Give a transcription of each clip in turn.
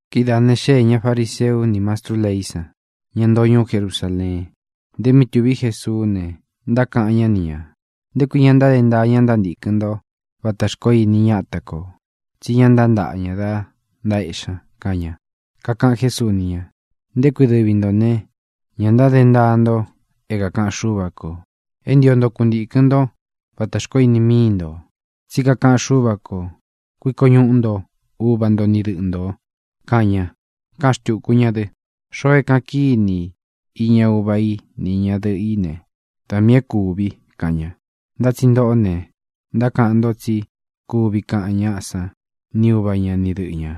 Kidáā ne, xéē ña fariseu ní mastrú leí san, ña ntoo ñuú Jerusaleén, nte mí tuví Jesuú ne, ntákaꞌan ñá ni ñā: —¿Nté kui ña ntáde ntaa ña ntántīkɨn ntó vatā xkoó ini ñáta kō? Tsí ña ntántaꞌa ña dá ntaéꞌxi ña —kaꞌan ña. Kakaꞌan Jésuu ni ña: —¿Nté kui dɨvi ntō ne, ña ntáde ntaa nto é kākaꞌan Xúva kō, é ntio nto kuntīkɨn ntó vatā xkoó ini míi ntō? Tsí kakaꞌan Xúva kō: “Kuiko ñuꞌu nto uva nto ni dɨꞌɨ ntō”, kaꞌan ña. Káꞌan xtūku ña dɨ: “Xoo é kāꞌan kíni i iña uva i ni iña dɨꞌɨ í ne, da miī é kūvi i”, kaꞌan ña. Ntá tsi ntōꞌó ne, ntákaꞌan nto tsí kuvi kaꞌan ñáꞌa san ni uva ña ni dɨꞌɨ ñā: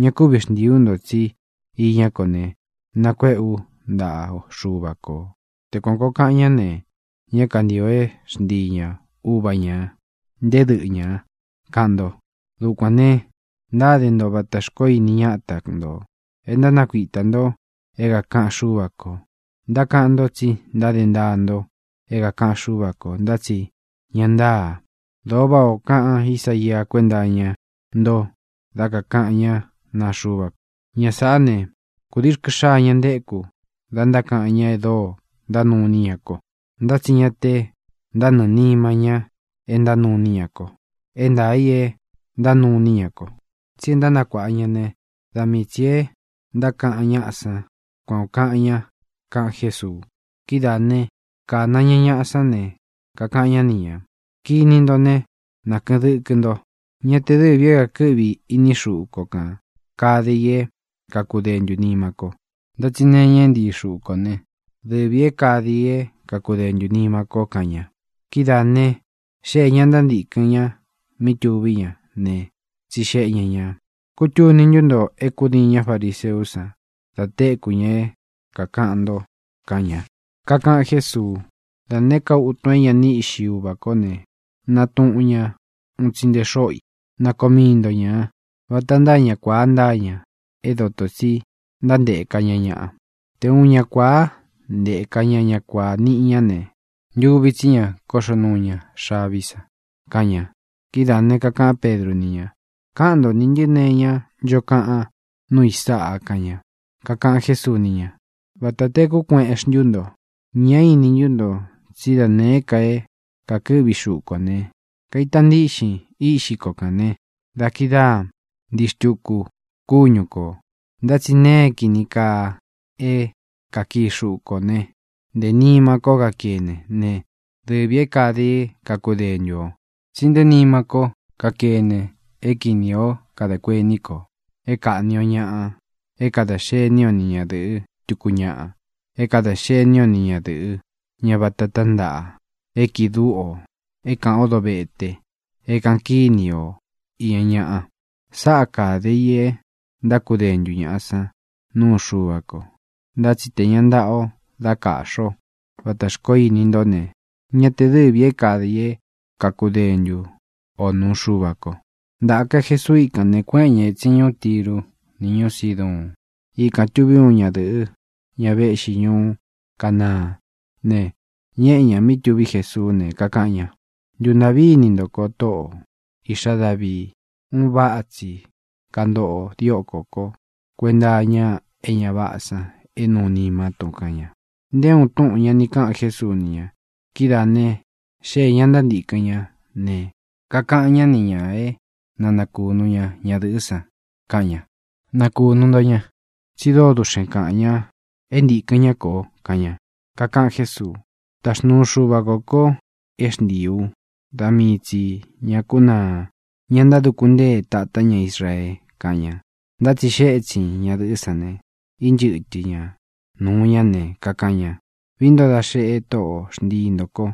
“Ña kúvi xntīi ú nto, tsí iñá ko ne, nākuéꞌe ú ntaꞌa Xuva kō.” Te kuan kōo kaꞌan ñá ne, ñá kantīo é xntii ña uva ñā nté dɨꞌɨ ñā, kaꞌan nto. Dukuān ne, ntáde nto vatā xkoó ini ñáta ntō e ntánakuitā nto é kākaꞌan Xúva kō. Ntákaꞌan ntó tsi ntáde ntaa nto é kākaꞌan Xúva kō, ntá tsi ña ntáā. Dōo váꞌā o kaꞌan Ísaia kuénta iña nto dá kakāꞌan ñá naa Xuva ko: Ña sāꞌá ne, kūdii rkɨ xaa ña ntéku da ntákaꞌan ñá e dóo ntánuu iní ña ko, ntá tsi ña te ntánɨɨ̄ nima ñá e ntánuu iní ña ko. E ntaā í e ntánuu iní ña ko, tsi e ntánakuāꞌa ñá ne, da mii tsī e ntákaꞌan ñáꞌa san. Kuan ō kaꞌan ña —kaꞌan Jésuu. Kidáā né, kāna ña ñaꞌa sán ne, kakaꞌan ñá ni ñā: —Kini nto né, na kɨꞌɨn dɨkɨ nto: Ñá te dɨ̄vi é kakɨꞌvi ini xúꞌu ko kān kade i é kakudentū nima ko, ntá tsi nee iña é ntii xuꞌu kō né, dɨvī é kade i é kakudentū nima ko —kaꞌan ña. Kidáā ne, xéē ña ntántīkɨn ña mí tuví ña ne, tsixeꞌe ña ñā: —¿Kútuni ntú nto é kūdiin ñá fariseú san da téku ña é kākaꞌan nto? —kaꞌan ña. Kakaꞌan Jésuu: —Da nēé ka utun é ña ni íꞌxi Uvā kó ne, nātuꞌun ña uun tsi nte xóꞌo i. Na koo mii nto ñā. Vata ntáa ña kuāa ntáa ña é dotō tsi ntántēka ña ñaꞌa. Te uun ña kuāá nteka ña ña kuāa niꞌi ña ne, ntuvi tsí ña kóꞌxo nuu ña xaví san —kaꞌan ña. Kidáā ne, kakaꞌán Pedru ni ña: —Káꞌan nto nī ntɨ́ nee iñá ncho kaꞌan núu i sáꞌa —kaꞌan ña. Kakaꞌan Jésuu ni ña: —¿Vāta tekú kueꞌen xntú nto? ¿Ñá ini ntú nto tsí da nēé ka é kākɨ́ꞌvi xuꞌu kō ne, kaita ntiꞌxin iꞌxí ko kān ne, da kidáa ntīi xtuku kúñu kō? Ntá tsi nēe é kīni kaa é kakii xuꞌu kō né, ntē nima ko kakéne ne, dɨvī é kade i é kakudentu ō. Tsi nté nima ko kakéne é kinī ó kadā kuení kō, é kāꞌni o ñaꞌa, é kadā xení o ni ñadɨ̄ꞌɨ́ tuku ñaꞌa, é kadā xení o ni ñadɨ̄ꞌɨ́, ña vata tántaꞌa, e kiꞌi dúꞌu ō, é kāꞌan ó dovete, é kāꞌan kíni o iña ñaꞌa. Sáꞌa kāde i e ntákudentū ñaꞌa sán nuu Xuva ko. Ntá tsi te ña ntaꞌa o da kaꞌxi o vatā xkoó ini ntó ne, ña te dɨ́vi ī é kade i é kakudentu ō nuu Xuva ko. Ntāka Jesuu íkān ne, kuéꞌen ña ētsin ñuú Tiru ni ñuú Siduun. Ikān tuví uun ñadɨ̄ꞌɨ́, ña véꞌxi ñuú Canaán ne, ñéꞌe ñā mí tuví Jesuú ne, kakaꞌan ña: —¡Ntuntāꞌví ini nto ko, Tóꞌō, Iꞌxá Davii! ¡Un váꞌa tsi kantoꞌo diókō kó kuenta iña é ña váꞌā san é nuu nimá tun! —kaꞌan ña. Nté uun túꞌūn ña ni káꞌan Jésuu ni ña. Kidáā ne, xéē ña ntántīkɨn ñá ne, kakaꞌan ñá ni ñā é na nakunu ña ñadɨ̄ꞌɨ́ san. Kaꞌan ña: —Nakūnu nto ña, tsi dóo duꞌxen kaꞌān ña é ntīkɨn ñá kō —kaꞌan ña. Kakaꞌan Jésuu: —Taxnuu Xuva kō ko é xntiī ú da mii tsī ña kúnaa, ña ntáduku ntée tatá ña Israee —kaꞌan ña. Ntá tsi xée etsin ñadɨ̄ꞌɨ́ san ne, ínchɨtɨ ña nūu ña ne, kakaꞌan ña: —¡Vií nto da xeꞌe, Tóꞌo, xntii ntō ko!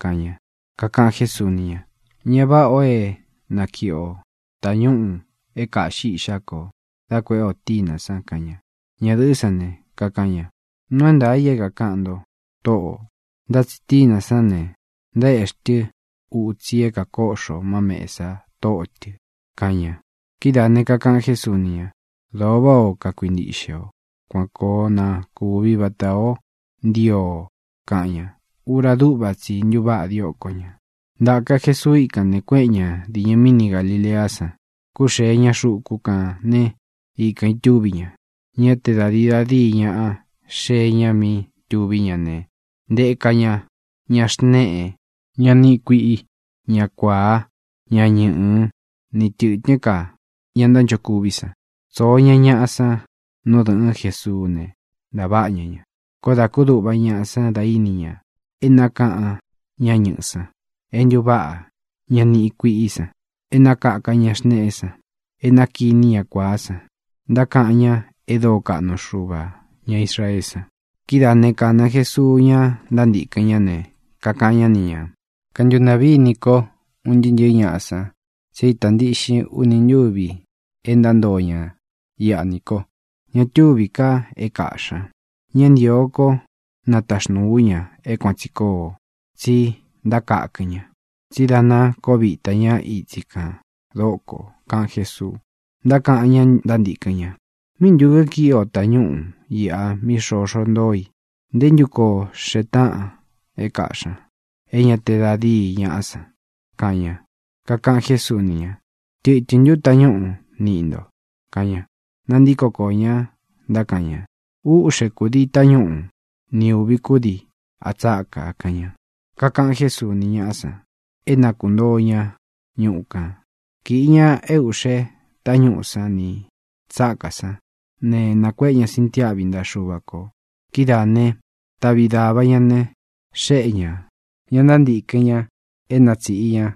—kaꞌan ña. Kakaꞌan Jésuu ni ña: —Ñá vāꞌá ō é nakiꞌi o tañúꞌū é kāꞌxí iꞌxá kō dá kuēꞌé ō tínā san —kaꞌan ña. Ñadɨ̄ꞌɨ́ san ne, kakaꞌan ña: —Nuu é ntaā i é kākaꞌan nto, Tóꞌō, ntá tsi tínā sán ne, ntaéꞌxi tɨ utsi i é kākoꞌxo má mēsa tóꞌo tɨ̄ —kaꞌan ña. Kidáā ne, kakaꞌan Jésuu ni ña: —Dōo váꞌā ó kakuintiꞌxe o. Kuan koo na kuvi vatā ó ntio o —kaꞌan ña. Ura dúꞌva tsi i ntuváꞌa dióko ñā. Ntāka Jesuu íkān ne, kuéꞌen ña dīñɨ míni Galileá san. Kúxee ña xuku kān né, ikān itúvi ña. Ñá te da dīi da díi ñaꞌa xée ña mí tuví ña ne, ntēka ña ña xnéꞌe, ña niꞌi kuiꞌí i, ña kuāá, ña ñɨꞌɨ̄, ni tɨ̄tɨ́n ka ña ntánchokuví san. Tsōo ña ñaꞌa san nú dɨ̄ꞌɨ́n Jesuú ne, ntaváꞌa ña ña. Koó dā kúduꞌva ñaꞌa san da íni ña e ntákaꞌan ñá ñɨꞌɨ̄ san, e ntuváꞌa ña niꞌi kuiꞌí i san, e nakaka ña xneꞌé san, e nakiní ña kuāá san. Ntákaꞌan ña e dóo kaꞌnu Xuva ña Israeé san. Kidáā ne, kāna Jesuu ñá ntántīkɨn ñá ne, kakaꞌan ñá ni ñā: —Kantuntaꞌví ini kó un ntɨɨ́ ntɨ̄ɨ́ ñaꞌa san tsi é īta ntíꞌxin uni ntúvi e ntántoo ña iꞌa nī ko. Ña túvī ka é kaꞌxī ña. Ñá ntīo kó nataxnūu ú ña é kuan tsī koo, tsi ntákakɨn ña, tsí dā ná koo vita ña itsi kān dókō —kaꞌan Jésuu. Ntákaꞌan ñá ntántīkɨn ña: —¿Míꞌi ntu kikīꞌi o tañúꞌū iꞌa mí xoxo ntoo i? ¿Nté ntu koo xee táꞌan é kaꞌxī ña, é ñā te da díi ñaꞌá san? —kaꞌan ña. Kakaꞌan Jésuu ni ña: —¿Tɨtɨ̄n ntú tañúꞌū niꞌi nto? —kaꞌan ña. Nantíko koō ña, ntákaꞌan ña: —Úꞌxe kūdii tañúꞌu ni ūvi kudii a tsákā —kaꞌan ña. Kakaꞌan Jésuu ni ñáꞌa san é na kuntoo ña ñuꞌu kān. Kīꞌi ña e uꞌxé tañúꞌū sán nī tsákā sán ne, nākuéꞌe ña sintiáꞌvi ntaꞌa Xuva kō. Kidáā ne, taꞌvi dāva ñá ne, xéꞌe ñā ña ntántīkɨn ña é na tsīꞌi ña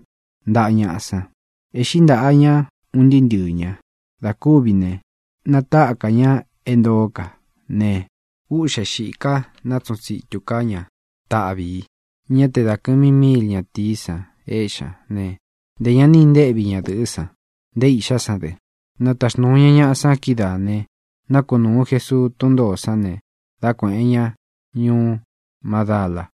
ntaꞌa ñaꞌa san. Ēꞌxí ntaꞌā ñá, un ntɨɨ́ ntɨɨ̄ ña. Dā kúvi ne, natáka ña é ntoó ka ne, úꞌxe xīka nátsuꞌun tsītu ká ña taꞌvi ī. Ñá te da kɨ̄mi míil ñatīí san éꞌxi ña ne, ntē ña ni intéꞌvi ñadɨ̄ꞌɨ́ san, nté iꞌxá san dɨ. Nataxnūu ña ñaꞌa san kídaā ne, nákunūu Jesuu tún ntōó san ne, da kuéꞌen ña ñūú Madala.